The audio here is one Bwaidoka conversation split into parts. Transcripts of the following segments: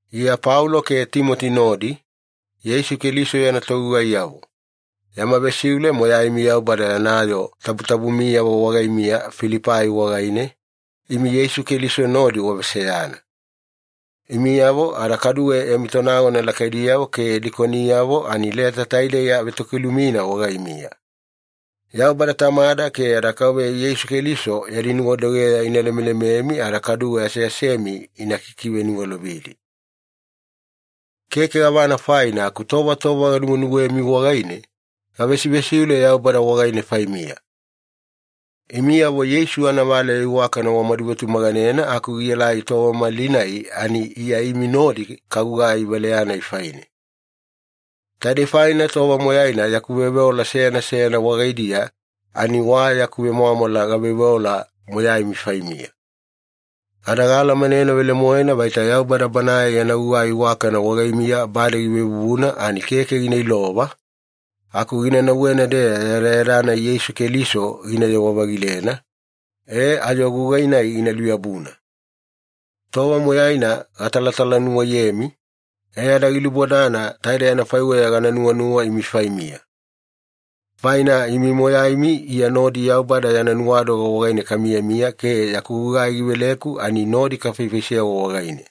Iya Paulo ke Timoti nodi, Yeisu Keliso yana togugaiyavo. Yama vesiule moyaimi Yaubada yana yoo tabutabumiyavo wagaimiya Filipai wagaine, imi Yeisu Keliso nodi waveseyana. Imiyavo ada kaduwe yami tonagona lakaidiyavo ke dikoniyavo ani leta taidei avetokilumina wagaimiya. Yaubada Tamada ke yada Kauveya Yeisu Keliso yadi nuwadogeya ina lemelememi ada kaduwe aseasemi ina kikiveniwalovidi. Keke gavana faina aku tova tova ganuwenuwemi wagaine, gavesivesiule Yaubada wagaine faimiya. Imiyavo Yeisu anavaleya iwakana wamadu vetumaganena aku gielai tova malinai ani Iya imi nodi kagugai valeya-nai faine. Taidei faina tova moyaina yaku veoveola seyana seyana wagaidiya ani wa yaku vemwamwala gaveoveola moyaimi faimiya. Ada gaalamanena velemoena vaita Yaubada Banae yana gugai iwakana wagaimiya bade givevuvuna ani keke gina ilova, aku gina nauwena-deya yadayada-nai Yeisu Keliso ginayewa-vagilena, e ayo gugai-nai gina luyabuna. Tova moyaina gatalatalanuwaiyemi, e ada gilubodana taidei anafaiweya gana nuwanuwa imi faimiya. Faina imi moyaimi Iya nodi Yaubada yana nuwadoga wagaine kamiyamiya ke yaku gugai giveleku ani nodi kafaifaisewa wagaine.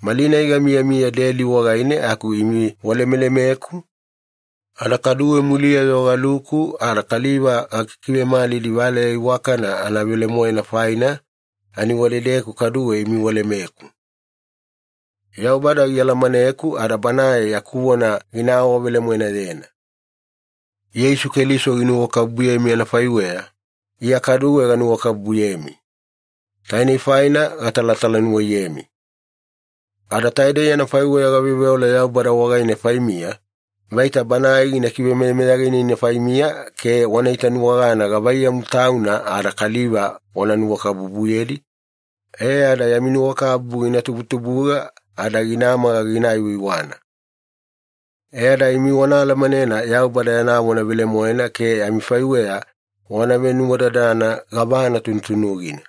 Malinai gamiyamiya deli wagaine aku imi walemelemeku, ada kaduwe muliya-yo galuku ada kaliva gakikivemalidi valeya iwakana anavelemoena faina ani wadedeku kaduwe imi walemeku. Yaubada gialamaneku ada Banae yaku vona gina awavelemoenayena. Yeisu Keliso ginuwakabubuyemi anafaiweya, Iya kaduwe ganuwakabubuyemi. Taine faina gatalatalanuwaiyemi. Ada taidei anafaiweya gaveoveola Yaubada wagaine faimiya, vaita Banae gina kivemeyameyaganina faimiya ke wana itanuwagana gavaiyamu Tauna ada kaliva wana nuwakabubuyedi, e ada yami nuwakabubu gina tubutubuga ada gina maga gina aiwaiwana. E ada imi wana alamanena Yaubada yana vona velemoena ke amifaiweya wana venuwadadana gavana tunutunugina.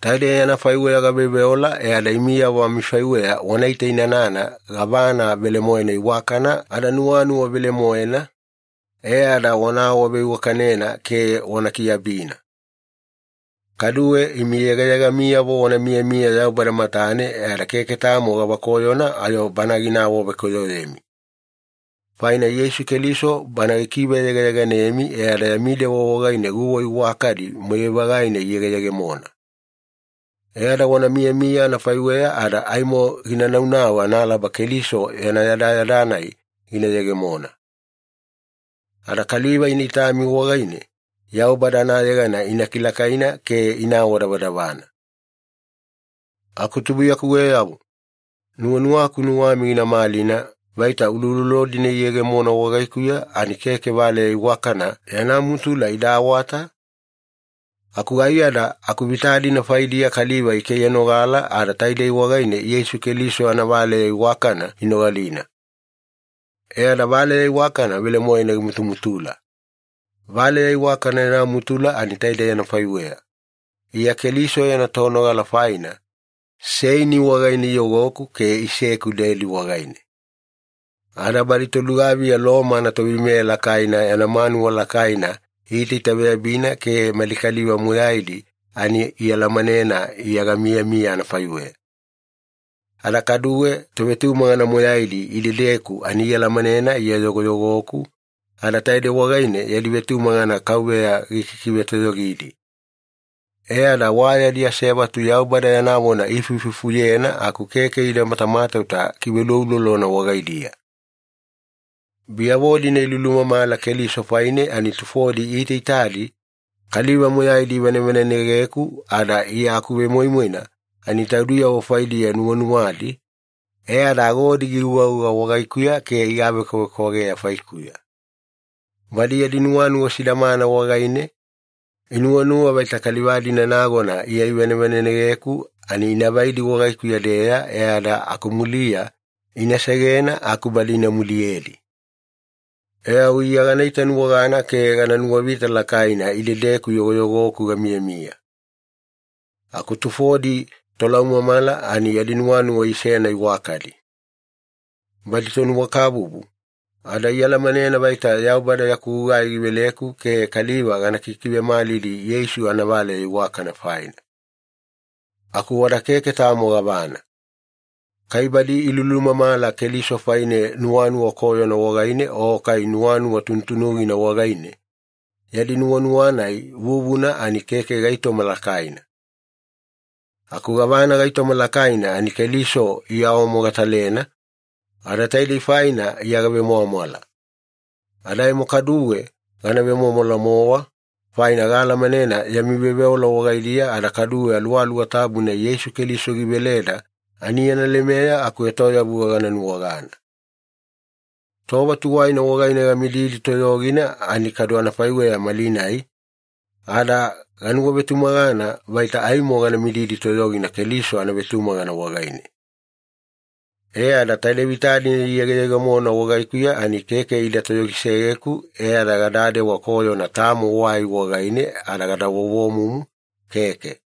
Taidei anafaiweya gaveoveola e ada imiyavo amifaiweya wana itainanana gavana velemoena iwakana ada nuwanuwa velemoena, e ada wana awaveiwakanena ke wana kiabina. Kaduwe imi yegayegamiyavo wana miyamiya Yaubada matane e ada keke tamo gavakoyona ayo Bana gina awavekoyoyemi. Faina Yeisu Keliso Bana gikiveyegayeganemi e ada yami dewa wagaine guwa iwakadi moyai-vagaina iyegeyegemona. E ada wana miyamiya anafaiweya ada aimo gina naunau analaba Keliso yana yadayada-nai gina yegemona. Ada kaliva ina itami wagaine, Yaubada anayegana ina kilakaina ke ina awadavadavana. Aku tubuiyakuweyavo, nuwanuwaku nuwami gina malina vaita uloulolo-dina iyegemona wagaikuya ani keke valeya iwakana yana mutula ida awata, aku aiyada akuvita-dina faidiya kaliva ikaiyanogala ada taidei wagaine Yeisu Keliso anavaleya iwakana inogalina. E ada valeya iwakana velemoena gimutumutula. Valeya iwakana yana mutula ani taidei anafaiweya. Iya Keliso yana tonogala faina, seini wagaine iyogoku ke iseku deli wagaine. Ada badi tolugaviya Loma anatoveimeya lakaina yana manuwa lakaina iitaitaveyabina ke mali kaliva moyaidi ani ialamanena Iya gamiyamiya anafaiweya. Ada kaduwe tovetumagana moyaidi idedeku ani ialamanena Iya yogoyogoku, ada taidei wagaine yadi vetumagana Kauveya gikikivetoyogidi. E ada wa yadi asevatu Yaubada yana vona iifuifufuyena aku keke ida matamatauta kiveuloulolona wagaidiya. Biyavo-dina ilulumamala Keliso faine ani tufodi iitaitadi kaliva moyaidi ivanevanenegeku ada Iya akuvemoimoina ani taudiyavo faidiya nuwanuwadi, e ada agodi giugauga wagaikuya ke igavekwavekwageya faikuya. Badi yadi nuwanuwa sidamana wagaine, inuwanuwa vaita kaliva-dina nagona Iya ivanevanenegeku ani ina vaidi wagaikuya-deya, e ada akumuliya ina segena aku badi ina muliyedi. E au Iya gana itanuwagana ke gana nuwavita lakaina idedeku yogoyogoku gamiyamiya. Aku tufodi tolaumamala ani yadi nuwanuwa isena iwakadi. Badi tonuwakabubu, ada ialamanena vaita Yaubada yaku gugai giveleku ke kaliva gana kikivemalidi Yeisu anavaleya iwakana faina. Aku wada keke tamo gavana. Kai badi ilulumamala Keliso faine nuwanuwa koyona wagaine o kai nuwanuwa tunutunugina wagaine, yadi nuwanuwa-nai vuvuna ani keke gaitoma lakaina. Aku gavana gaitoma lakaina ani Keliso iawamogatalena, ada taidei faina Iya gavemwamwala. Ada aimo kaduwe gana vemwamwala-mowa, faina gaalamanena yami veoveola wagaidiya ada kaduwe Aluwaluwa Tabuna Yeisu Keliso giveleda ani yana lemeya akuetoyavuga gana nuwagana. Tova tuwaina wagaine gamididi toyogina ani kadu anafaiweya malinai, ada ganuwavetumagana vaita aimo gana mididi toyogina Keliso anavetumagana wagaine. E ada taide vita-dina iyegeyegemona wagaikuya ani keke ida toyogisegeku e ada gadadewa koyona tamo wai wagaine ada gada vovomumu, keke.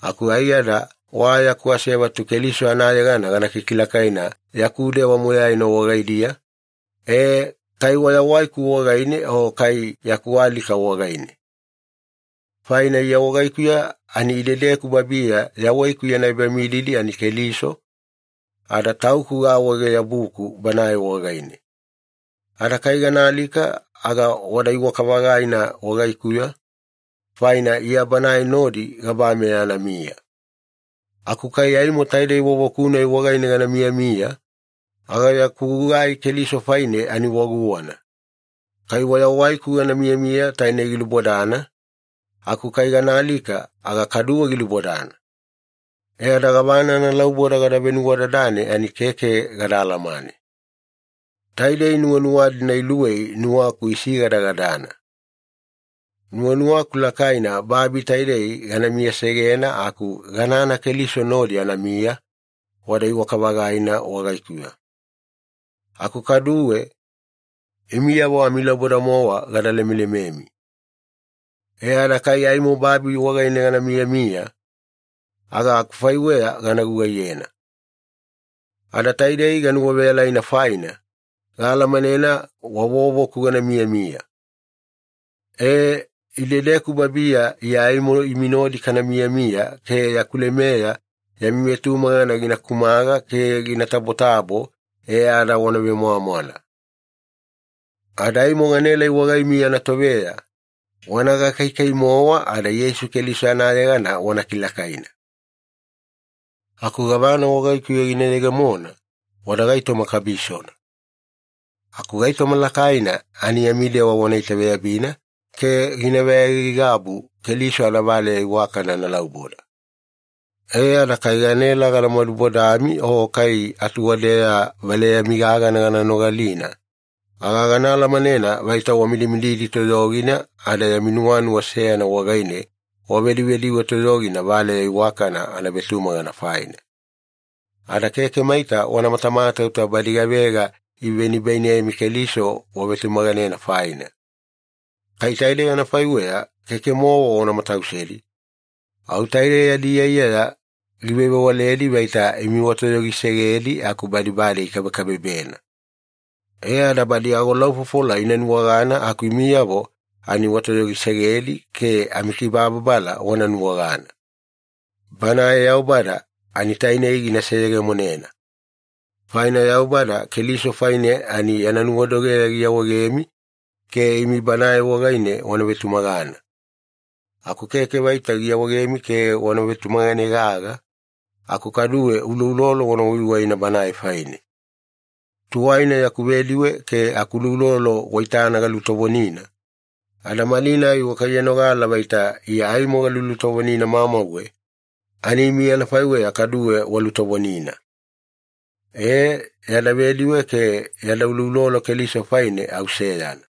Aku aiyada wa yaku asevatu Keliso anayegana gana kikilakaina yaku dewa moyaina wagaidiya, e, kai wayawaiku wagaine o kai yaku alika wagaine. Faina Iya wagaikuya ani idedeku babiya yawaiku yana ebamididi ani Keliso, ada tauku gaawaege-yabuku Banae wagaine. Ada kai gana alika aga wada iwaka-vagaina wagaikuya, faina Iya Banae nodi gabameya anamiya. Aku kai aimo taidei vovoku-nai wagaine gana miyamiya, aga yaku gugai Keliso faine ani wa guwana. Kai wayawaiku gana miyamiya tainei gilubodana, aku kai gana alika aga kaduwe gilubodana. E ada gavana analauboda gada venuwadadane ani keke gada alamane. Taidei nuwanuwa-dina iluwei nuwaku isigadagadana. Nuwanuwaku lakaina babi taidei gana miyasegena aku ganana Keliso nodi anamiya, wada iwaka-vagaina wagaikuya. Aku kaduwe, imiyavo amilauboda-mowa gada lemelememi. E ada kai aimo babi wagaine gana miyamiya, aga akufaiweya gana gugaiyena. Ada taidei ganuwaveyalaina faina, gaalamanena wa vovoku gana miyamiya. E, idedeku babiya Iya aimo imi nodi kana miyamiya ke yaku lemeya yami vetumagana gina kumaga ke gina tabotabo, e ada wana vemwamwala. Ada aimo ganaelai wagaimiya anatoveya, wana gakaikai-mowa ada Yeisu Keliso anayegana wana kilakaina. Aku gavana wagaikuya gina yegemona, wada gaitoma kabisona. Aku gaitoma lakaina ani yami dewa wana itaveyabina ke gina veaigaigabu Keliso anavaleya iwakana analauboda. E ada kai ganaela gana madubodami o kai atuwadeya valeyami gagana gana nogalina, aga gana alamanena vaita wamidimididi toyogina ada yami nuwanuwa seyana wagaine wavedivediwe toyogina valeya iwakana anavetumagana faina. Ada keke maita wana matamatauta badi gavega ivenibainemi Keliso wavetumaganena faina. Kai taidei anafaiweya keke-mowa wana matausedi, au taide yadi iyaiyaya givevewaledi vaita imi watoyogisegedi aku badi bade ikabekabebena. E ada badi agolaufofola ina nuwagana aku imiyavo ani watoyogisegedi ke amikibababala wana nuwagana. Banae Yaubada ani tainei gina seyegemonena. Faina Yaubada Keliso faine ani yana nuwadogeya giawaegemi ke imi Banae wagaine wana vetumagana. Aku keke vaita giawaegemi ke wana vetumagane gaga, aku kaduwe uloulolo wana waiwaina Banae faine. Tuwaina yaku vediwe ke akuloulolo waitana galutovonina, ada malinai wakaiyanogala vaita Iya aimo galulutovonina mamauwe, ani imi anafaiweya kaduwe walutovonina. E, yada vediwe ke yada uloulolo Keliso faine au seyana.